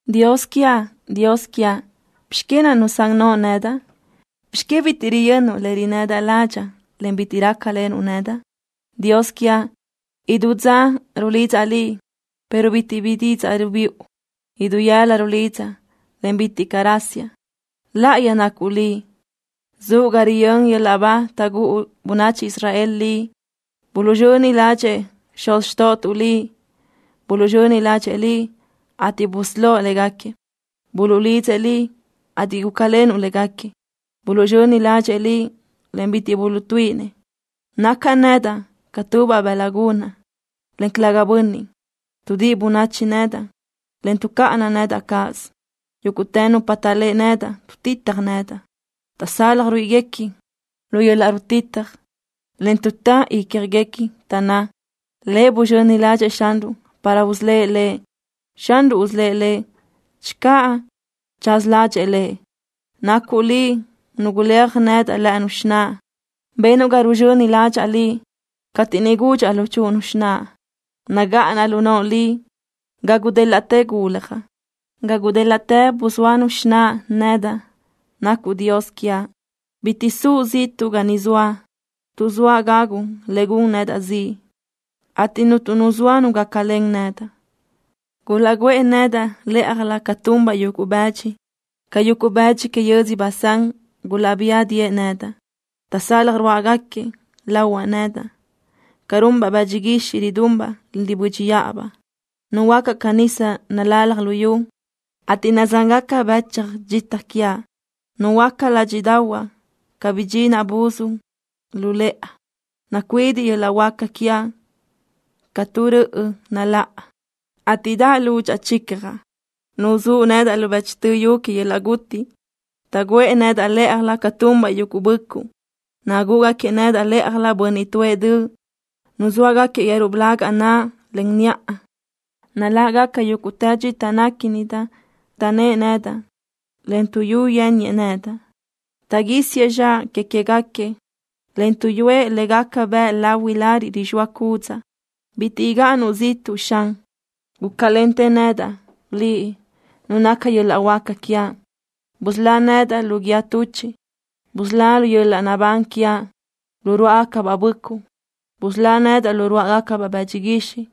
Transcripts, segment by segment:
Dios quiaʼ, Dios quiaʼ, ¿bizx que nusán noʼo nedaʼ? ¿Bizx que bitiʼ riyönnuʼ le rinnëdaʼ ládxaʼa, en bitiʼ rácalenuʼ nedaʼ? Dios quiaʼ, idú dza rulidzaʼ Liʼ, pero bitiʼ bi didzaʼ rubiʼu. Idú yëla rulidzaʼ, en bitiʼ caʼ rasiaʼ. Láʼayi nacuʼ Liʼ. Zuʼ ga riyö́n yöl-laʼ ba taʼgúʼu bönachi Israel Liʼ. Buluʼzxöni ládxëʼë xuz xtóʼotuʼ Liʼ. Buluʼzxöni ládxëʼë Liʼ, ateʼ busölóʼ légaquiëʼ. Buluʼlidzëʼ Liʼ, ateʼ gúcalenuʼ légaquiëʼ. Buluʼzxöni ládxëʼë Liʼ, en bitiʼ buluʼtuíʼinëʼ. Nacaʼ nedaʼ ca tubaʼ bëla gunaʼ, en calëga bönniʼ. Tuʼdíʼi bönachi nedaʼ, en tuʼcáʼana nedaʼ cáʼasö. Yúguʼtë nupa taʼléʼe nedaʼ tuʼtitaj nedaʼ. Taʼsalaj ruíʼiguequi lu yöl-laʼ rutitaj, en tuʼtá ícjaguequi, taʼnná: “Lëʼ buzxöni ládxëʼë Xanruʼ para usölë́ʼ lëʼ. Xanruʼ usölë́ʼ lëʼ channö tsaza ládxëʼë lëʼ.” Nacuʼ Liʼ Nu guléaj nedaʼ lë́ʼënu xináʼa. Benuʼ ga ruzxöni ládxaʼa Liʼ cateʼ niʼ gúdxaʼa luchúʼunu xináʼa. Nagáʼanaʼ lu noʼo Liʼ ga gudélaʼtë guljaʼ. Ga gudélaʼtë buzóanu xináʼa nedaʼ nacuʼ Dios quiaʼ. Bitiʼ suʼ ziʼtuʼ ga ni zoaʼ, tuʼ zoa gagu le gun nedaʼ ziʼ, ateʼ cúnturö nu zoa nu gácalen nedaʼ. Gulaʼguʼë nedaʼ lë́ʼajlö ca tunbaʼ yuguʼ bëdxi. Ca yuguʼ bëdxi que yödzö Basán gulaʼbía diʼë nedaʼ. Taʼsalaj ruáʼagaquiëʼ lahuaʼ nedaʼ ca runbaʼ bëdxi guixiʼ, ridunbaʼ, en ribö́dxiʼabaʼ. Nuhuöácaʼ ca nisa nalalaj luyú, ateʼ nazángaca bëch dxita quiaʼ. Nuhuöáca ládxiʼdaʼahuaʼ ca bidxinaʼ buz la lu lëʼa. Nacuidiʼ yöl-laʼ huáca quiaʼ ca tu röʼö naláʼa, ateʼ daʼ lúdxaʼa chichjaʼ. Nuzúʼ nedaʼ lu bëchtö yu que yöl-laʼ guti. Taʼguʼë nedaʼ lë́ʼajlö ca tunbaʼ yuguʼ böʼcuʼ. Nagúʼugaquiëʼ nedaʼ lë́ʼajlö bönniʼ tuʼë döʼ. Nuzóagaquiëʼ yeru blaga naʼa, en niʼa. Naláʼgaca yúguʼtë dxita néquinidaʼ. Taʼnë́ʼë nedaʼ, en tuʼyú yénniëʼ nedaʼ. Taʼguísiëʼ zxaʼ que queë́gaquiëʼ, en tuʼyúëʼ le gaca bëʼ lahui lariʼ rixóa cúdzaʼa. Bitiʼ gáʼanuʼ ziʼtuʼ, Xan. Gúcalentë nedaʼ, Liʼ, Nu naca yöl-laʼ huáca quiaʼ. Busölá nedaʼ lu guíë tuchiʼ. Busölá yöl-laʼ naʼbán quiaʼ lu ruáʼagacabaʼ böʼcuʼ. Busölá nedaʼ lu ruáʼagacabaʼ bëdxi guixiʼ,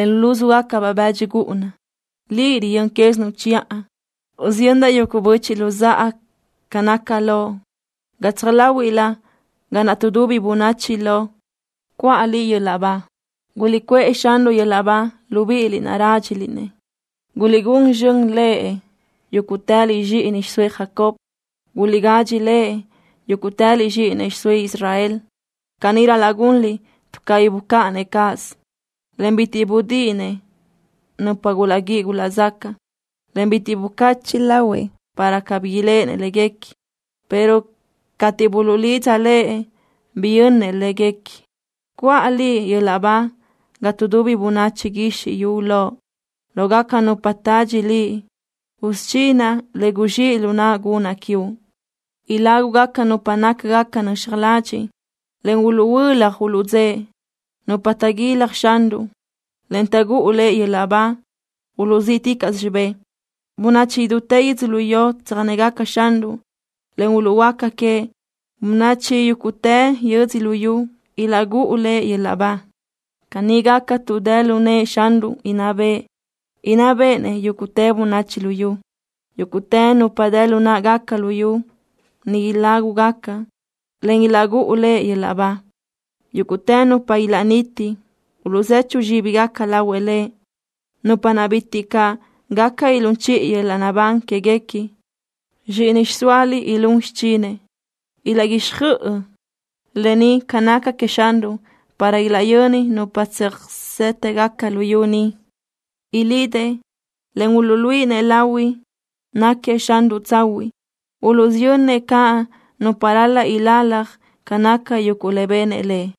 en lu lúzugacabaʼ bëdxi gúʼuna. Liʼ riyö́n quézinuʼ chiʼa. Usiyöndaʼ yuguʼ böchiʼ luzáʼa ca naca Loʼ. Gatsaj láhuiʼlö ga naʼ tuʼdubi bönachi loʼ cuʼa Liʼ yöl-laʼ ba. ¡Guliʼcuʼë Xanruʼ yöl-laʼ ba, libíʼiliʼ naʼ rádxiliʼ-nëʼ! ¡Guliʼgun zxön Lëʼ, yúguʼtëliʼ zxíʼini xiʼsóëʼ Jacob! ¡Guliʼgadxi Lëʼ, yúguʼtëliʼ zxíʼini xiʼsóëʼ Israel! Caní ral-laʼ gunliʼ tuʼ cabí bucáʼanëʼ cáʼasö, en bitiʼ budíʼinëʼ nupa gulaʼguíʼi gulaʼzacaʼ, en bitiʼ bucachiʼ lahuëʼ para cabí iléʼenëʼ léguequi, pero cateʼ buluʼlidza Lëʼ, biyönnëʼ léguequi. Cuʼa Liʼ yöl-laʼ ba ga tuʼdubi bönachi guizxi yu loʼ. Lógaca nupa tadxi Liʼ usudxinaʼ le guzxíʼ lu naʼa gunaʼ quiuʼ. Ilágugaca nupa nácagaca nöxaj ladxiʼ, en uluʼhuölaj uluʼdzëʼe. Nupa taʼguilaj Xanruʼ, en taʼgúʼu Lëʼ yöl-laʼ ba uluʼzíʼticaʼsö xibë́ʼ. Bönachi idútë yödzölió tsöjnégaca Xanruʼ, en uluʼhuöáca queëʼ. Bönachi yúguʼtë yödzö luyú ilaʼgúʼu Lëʼ yöl-laʼ ba. Caní gaca tuʼ dë lu nëʼë Xanruʼ inná bëʼë. Inná béʼenëʼ yúguʼtë bönachi luyú. Yúguʼtë nupa dë lu náʼagaca luyú ni ilágugaca, en ilaʼgúʼu Lëʼ yöl-laʼ ba. Yúguʼtë nupa ilaʼniti uluʼzechu zxíbigaca lahuëʼ Lëʼ, nupa naʼ bitiʼ caʼ gaca ilún chiʼi yöl-laʼ naʼbán quéguequi. Zxíʼini xiʼsóaliʼ ilún xichinëʼ. Ilaʼguixjöʼ lë ni ca naca queëʼ Xanruʼ para ilaʼyöni nupa tsöjsétëgaca luyú ni. Ilidëʼ, en uluʼluíʼinëʼ lahui náquiëʼ Xanruʼ tsahuiʼ. Uluʼsiyönnëʼ caʼ nupa ral-laʼ ilalaj ca naca yuguʼ le benëʼ Lëʼ.